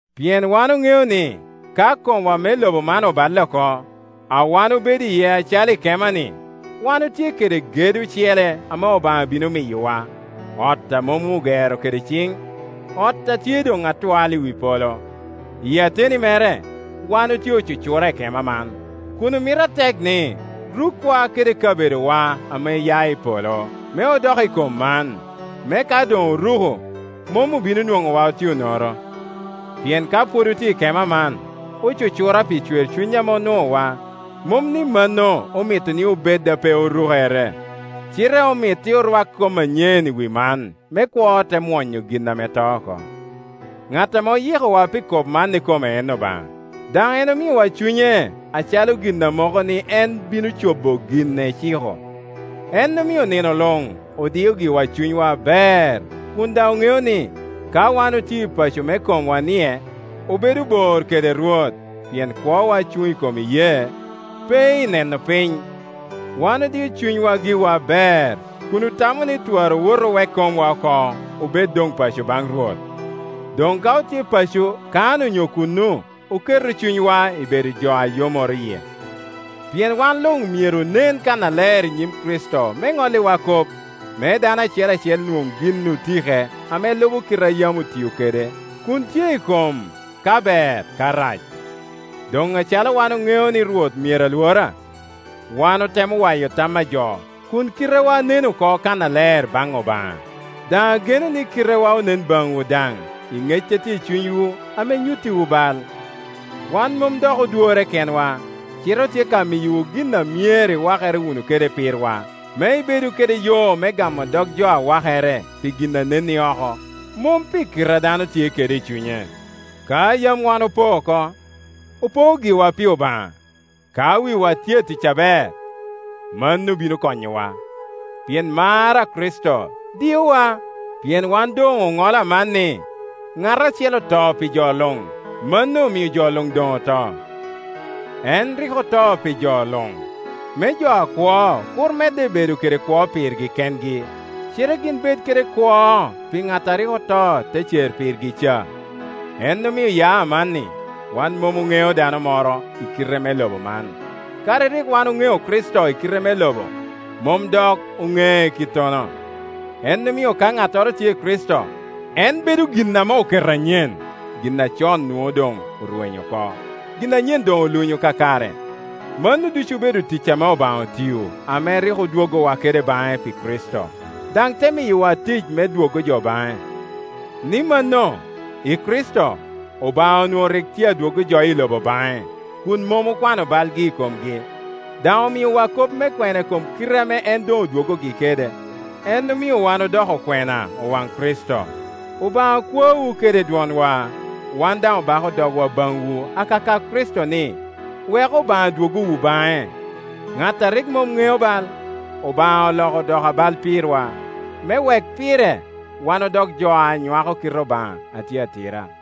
Pien wan oŋeo ni ka komwa me lobo man oballe oko, a wan obedo iye acalo i kema-ni, wan otye kede gedo ocele ame Obaŋa bino miyowa, ot a mom ogero kede ciŋ, ot a tye doŋ atwal i wi polo. Iyi ateni mere wan otye ocucura i kema man, kun omito atek ni rukwa kede kabedowa ame ya i polo, me odok i kom man, me ka doŋ oruko, mom obino nwoŋowa otye onoro. Pien ka pwod otye i kema man, ocucura pi cwercuny ame onuowa; mom ni mano omito ni obed a pe orukere, cite omit-ti orwak kom anyen i wi man, me kwo te mwonyo gin ame to oko. Ŋat ame oyikowa pi kop man ikome en Obaŋa, daŋ en omiowa Cunye acalo gin a moko ni en bino cobo gin eciko. En omio nino luŋ odio giwa cunywa aber, kun daŋ oŋeo ni, ka wan otye i paco me komwa-nie, obedo bor kede Rwot, pien kwowa cuŋ i kom iyee, pe i neno piny. Wan odio cunywa giwa aber, kun otamo ni twara owot owek komwa oko, obed doŋ paco baŋ Rwot. Doŋ ka otye paco kan onyo kuno, oketo cunywa i bedo jo a yomoro yie. Pien wan luŋ myeroonen kannaler i nyim Kricito me ŋolliwa kop, me dano acel acel nwoŋ gin otike ame lubo kite a yam otio kun tye i kom, ka ber ka rac. Doŋ acalo wan oŋeo ni Rwot myero alwora, wan otemo waya tam a jo, kun kitewa nen oko kannaler baŋ Obaŋa; daŋ ageno ni kitewa onen baŋwu daŋ, i ŋec a tye i cunywu ame nyuttiwu bal. Wan mom dok odworre kenwa, cite otye ka miyowu gin a myero iwakere wunu kede pirwa, me ibedu kede yo me gamo dog jo a wakere pi gin a nen i oko, mom pi kite a dano tye kede i cunye. Ka yam wan opoo oko, opoo giwa pi Obaŋa; ka wiwa tye atic aber, mano bino konyowu. Pien mar a Kricito diowa, pien wan doŋ oŋolo aman ni, ŋat acel oto pi jo luŋ; mano omio jo luŋ doŋ oto. En rik oto pi jo luŋ, me jo akwo kur medde bedo kede kwo pirgi kengi, cite gin bed kede kwo pi ŋat a rik oto te cer pirgi ca. En omio ya amanni, wan mom oŋeo dano moro i kite me lobo man; kadi rik wan oŋeo Kricito i kite me lobo, mom dok oŋee kittono. En omio ka ŋattoro tye i Kricito, en bedo gin ame oketo anyen; gin acon nwoŋo doŋ orwenyo oko, gin anyen doŋ olunyo kakare. Mano ducu obedo tic ame Obaŋa otio, ame rik odwoggowa kede baŋe pi Kricito, daŋ te miyowa tic me dwoggo jo baŋe; ni mano, i Kricito, Obaŋa onwoŋo rik tye adwoggo jo i lobo baŋe, kun mom okwano balgi i komgi, daŋ omiowa kop me kwena i kom kite ame en doŋ odwoggogi kede. En omio wan odoko okwena, owaŋ Kricito; Obaŋa kwaowu kede dwonwa, wan daŋ obako dogwa baŋwu akaka Kricito ni, weku Obaŋa dwoggowu baŋe. Ŋat a rik mom ŋeo bal, Obaŋa oloko odoko abal pirwa, me wek pire wan odok jo a nywako kite Obaŋa a tye atira.